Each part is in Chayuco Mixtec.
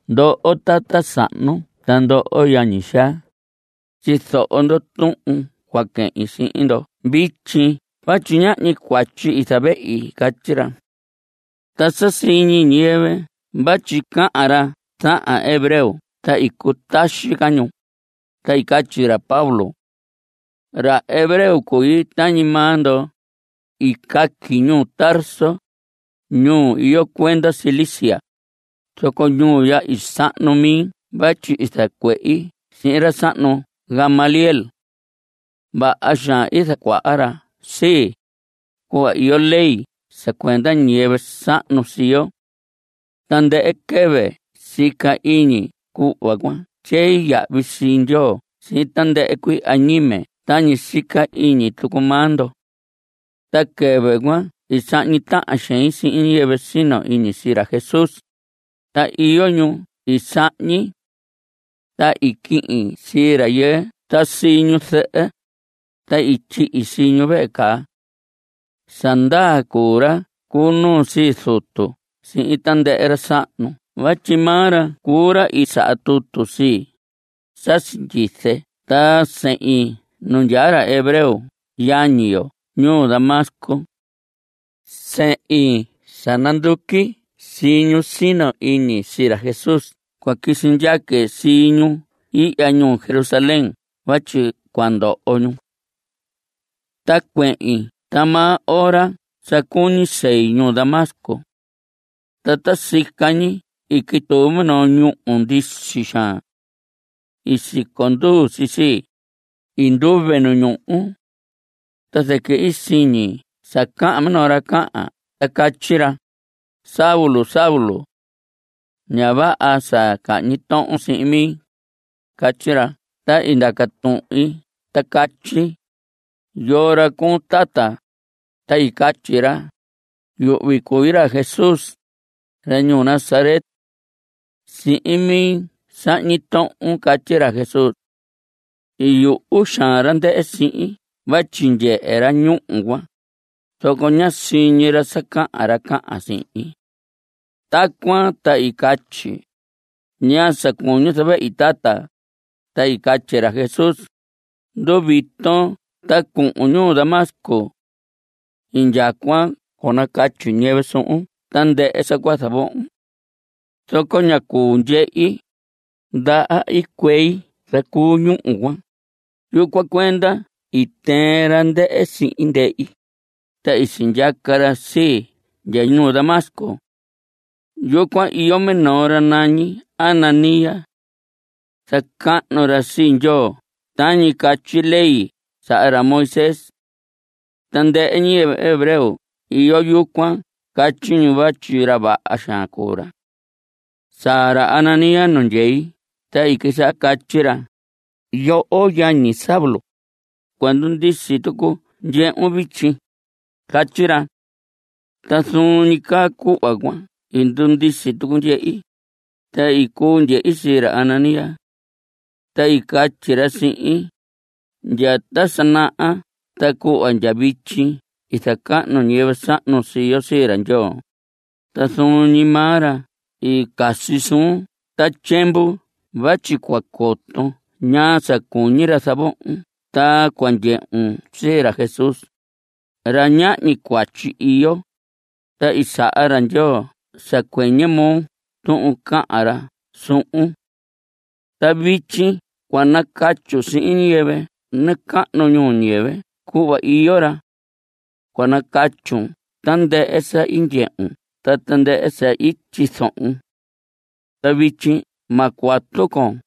Ndoho tata sahnu ta ndoho yañi xaa, tyizoho ndo tuhun cua quehin sihin ndo vityi vatyi ñahñi cuatyi i zavehi. Catyi ra. Ta sa siñi ñiyɨvɨ vatyi cahan ra zahan hebreo ta i cutaxi ca ñu. Ta i catyi ra Pablo. Ra hebreo cui tañi maa ndo. I caqui ñuu Tarso, ñuu iyo cuenda Cilicia, zoco ñuu ya i sahnu mi vatyi i zacuehi sihin ra sahnu Gamaliel. Vaha xaan i zacuaha ra sii, cuhva iyo ley sa cuenda ñiyɨvɨ sahnu sii yo. Tandɨhɨ quɨvɨ sica iñi cuhva cua tyei yahvi sii Ndyoo sihin tandɨhɨ cuii añime tañi sica iñi tucu maa ndo. Ta quɨvɨ cuan i sahñi tahan xein sihin ñiyɨvɨ sino iñi sii ra Jesús, ta iyo ñu i sahñi. Ta i quihin sii rayɨɨ ta sii ñu zɨhɨ, ta i tyihi sii ñu vehe caa. Sa ndaa cuu ra cu nuu sii zutu sihin tandɨhɨ ra sahnu vatyi maa ra cuu ra i saha tutu sii, sa sindyize ta sehin nu ndyaa ra hebreo yañi yo ñuu Damasco. Sehin sa nanduqui sii ñu sino iñi sii ra Jesús cua quisi ndyaque sii ñu ihya ñuu Jerusalén vatyi cua ndoho ñu. Ta cuehin ta maa ora sa cuñi sei ñuu Damasco. Ta ta sica ñi i quituu minoo ñúhu ndisi xaan. Siconduu si sii. I nduve nu ñuhu. Ta zɨquɨ i siñi sa cahan minoo ra cahan ta catyi ra: “Saulo, Saulo. Ña vaha sa cahñi tohon sihin mi,” catyi ra. Ta i ndaca tuhin ta catyi: “¿Yoo ra cuun, tata?” Ta i catyi ra: “Yuhvi cui ra Jesús, ra ñuu Nazaret. Sihin mi sahñi tohon.” Catyi ra Jesús. I yuhu xaan ra ndɨhɨ sihin vatyi ndyehe ra ñúhu cuan, zoco ña siñi ra sa cahan ra cahan sihin. Tacuan ta i catyi: “¿Ñaa sa cuñun zavehi tata?” Ta i catyi ra Jesús: “Nduviton ta cuhun ñuu Damasco. Indyacuan cua nacatyi ñiyɨvɨ suhun tandɨhɨ sa cua zavohon.” Zoco ñá cuu ndyehi. Ndaha i cuei zacuu ñuhu cuan. Yucuan cuenda i tɨɨn ra ndɨhɨ sihin ndehi, ta i sindyaca ra sii ndya ñuu Damasco. Yucuan iyo minoo ra nañi Ananías. Zacahnu ra sii Ndyoo tañi catyi ley saha ra Moisés. Tandɨhɨ ñiyɨvɨ hebreo iyo yucuan catyi ñu vatyi ra vaha xaan cuu ra. Saa ra Ananías nu ndyei ta i quisaha catyi ra: “Yoho yañi Saulo, cua ndundisi tucu ndyehun vityi.” Catyi ra. Ta zuun ñi caa cuhva cuan i ndundisi tucu ndyehi. Ta i cuu ndyehi sii ra Ananías. Ta i catyi ra sihin: “Ndya ta sa naha ta cuhva ndya vityi i zacahnu ñiyɨvɨ sahnu sii yo sii ra Ndyoo, ta zuun ñi maa ra i casi suun ta tyiemvu vatyi cua coton ñaa sa cuñi ra zavohon ta cua ndyehun sii ra Jesús, ra ñahñi cuatyi iyo. Ta i saha ra Ndyoo sa cuɨñɨ moo tuhun cahan ra suhun. Ta vityi cua nacatyun sihin ñiyɨvɨ nacahnu ñuu ñiyɨvɨ cuhva iyo ra. Cua nacatyun tandɨhɨ sa i ndyehun ta tandɨhɨ sa i tyizohon. Ta vityi ma cuatu con.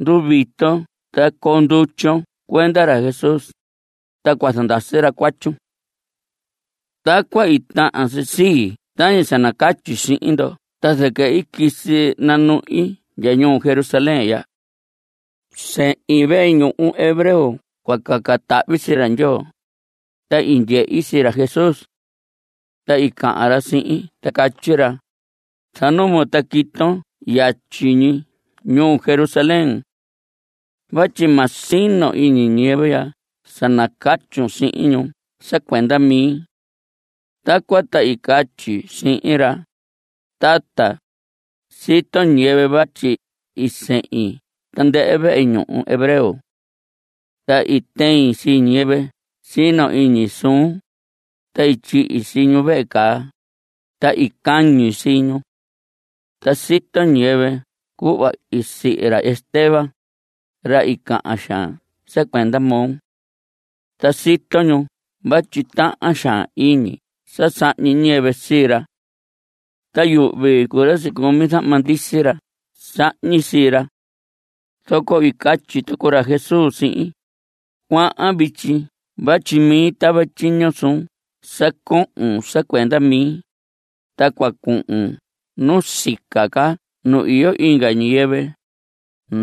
Nduviton ta coo ndutyon cuenda ra Jesús. Ta cua zandasi ra cuatyun.” Tacuan i tahan si sii tañi sa nacatyi sihin ndo ta zɨquɨ i quisi nanuhi ndya ñuu Jerusalén ya. Sehin vehe ñuhu hebreo cua caca tahvi sii Ndyoo, ta i ndyehi sii ra Jesús. Ta i cahan ra sihin ta catyi ra: “Zanumon, ta quiton yatyi ñi ñuu Jerusalén. Vatyi ma sino iñi ñiyɨvɨ ya sa nacatyun sihin ñu sa cuenda mi.” Tacuan ta i catyi sihin ra: “Tata, sito ñiyɨvɨ vatyi i sehin tandɨhɨ vehe ñuhu hebreo. Ta i tɨin sii ñiyɨvɨ sino iñi suun, ta i tyihi sii ñu vehe caa. Ta i cañi sii ñu. Ta sito ñiyɨvɨ cuhva i sihi ra Esteban, ra i cahan xaan sa cuenda moo. Ta sito ñu vatyi tahan xaan iñi sa sahñi ñiyɨvɨ sii ra. Ta yuhvi cuu ra i sicumi zahma ndisi ra sahñi sii ra.” Zoco i catyi tucu ra Jesús sihin: “Cuahan vityi vatyi mi tava tyiño suun sa cohon sa cuenda mi, ta cua cuhun nu sica ca nu iyo inga ñiyɨvɨ,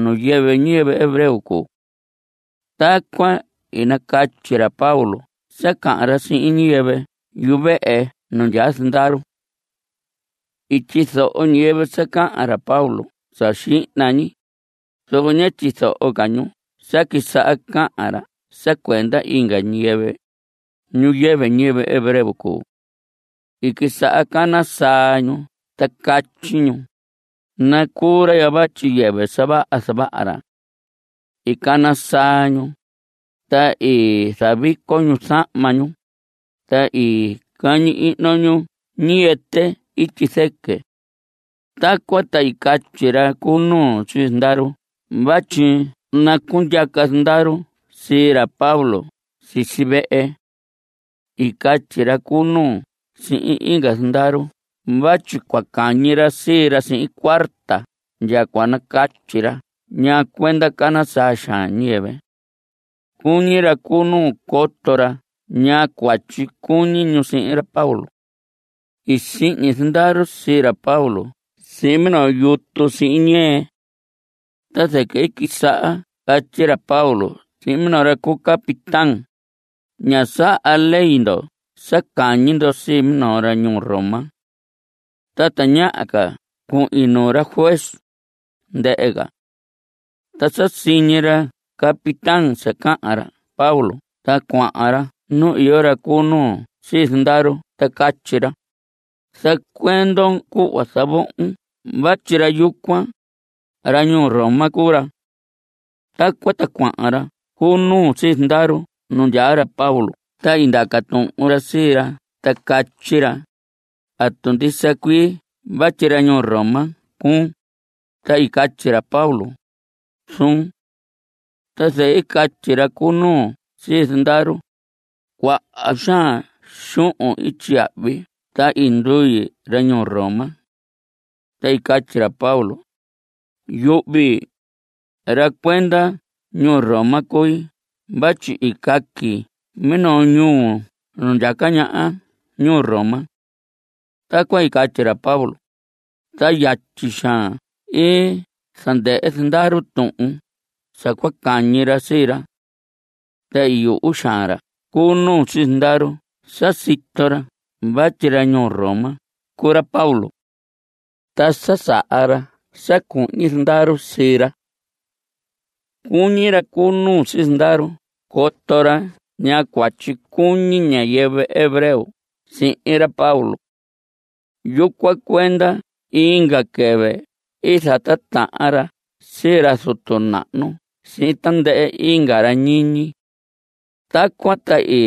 ñu yɨvɨ ñiyɨvɨ hebreo cuu.” Tacuan i nacatyi ra Pablo sa cahan ra sihin ñiyɨvɨ yuvehe nu ndyaa zandaru. I tyizoho ñiyɨvɨ sa cahan ra Pablo sa xihna ñi, zoco ñá tyizoho ca ñu sa quisaha cahan ra sa cuenda inga ñiyɨvɨ, ñu yɨvɨ ñiyɨvɨ hebreo cuu. I quisaha cana saa ñu ta catyi ñu: ¡Nacuu ra ya vatyi yɨvɨ sa vaha zavaha ra! I cana saa ñu, ta i zavico ñu zahma ñu, ta i cañi ihno ñu ñiyɨtɨ ityi zɨquɨ. Tacuan ta i catyi ra cu nuu sii zandaru vatyi nacundyaca zandaru sii ra Pablo sisi vehe. I catyi ra cu nuu sihin inga zandaru vatyi cua cañi ra sii ra sihin cuarta ndya cua nacatyi ra ñaa cuenda cana saa xaan ñiyɨvɨ. Cuñi ra cu nu coto ra ñaa cuatyi cuñi ñu sihin ra Pablo. I sihñi zandaru sii ra Pablo sihin minoo yutu sihin ñɨɨ. Ta zɨquɨ i quisaha catyi ra Pablo sihin minoo ra cu capitán: Ña saha ley ndo sa cañi ndo sii minoo ra ñuu Roma. Ta tañaha ca cuhin nuu ra juez, ndɨhɨ ca. Ta sa siñi ra capitán sa cahan ra Pablo ta cuahan ra nu iyo ra cu nuu sii zandaru ta catyi ra: Zacuendon cuhva zavohon vatyi ra yucuan, ra ñuu Roma cuu ra. Tacuan ta cuahan ra cu nuu sii zandaru nu ndyaa ra Pablo ta i ndaca tuhun ra sii ra ta catyi ra: ¿Atu ndisa cuii vatyi ra ñuu Roma cuun? Ta i catyi ra Pablo: Zuun. Ta zɨquɨ i catyi ra cu nuu sii zandaru: Cuaha xaan xuhun i tyiyahvi ta i ndui ra ñuu Roma. Ta i catyi ra Pablo: Yuhvi, ra cuenda ñuu Roma cui vatyi i caqui minoo ñuu nu ndyaca ñaha ñuu Roma. Tacuan i catyi ra Pablo, ta yatyi xaan i zandɨhɨ zandaru tuhun sa cua cañi ra sii ra. Ta i yuhu xaan ra cu nuu sii zandaru sa sito ra vatyi ra ñuu Roma cuu ra Pablo. Ta sa saha ra sa cuhñi zandaru sii ra. Cuñi ra cu nuu sii zandaru coto ra ñaa cuatyi cuñi ñiyɨvɨ hebreo sihin ra Pablo. Yucuan cuenda inga quɨvɨ i zatitahan ra sii ra zutu nahnu sihin tandɨhɨ inga ra ñiñi. Tacuan ta i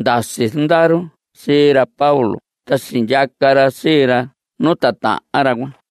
ndasi zandaru sii ra Pablo ta sindyaca ra sii ra nu titahan ra cuan.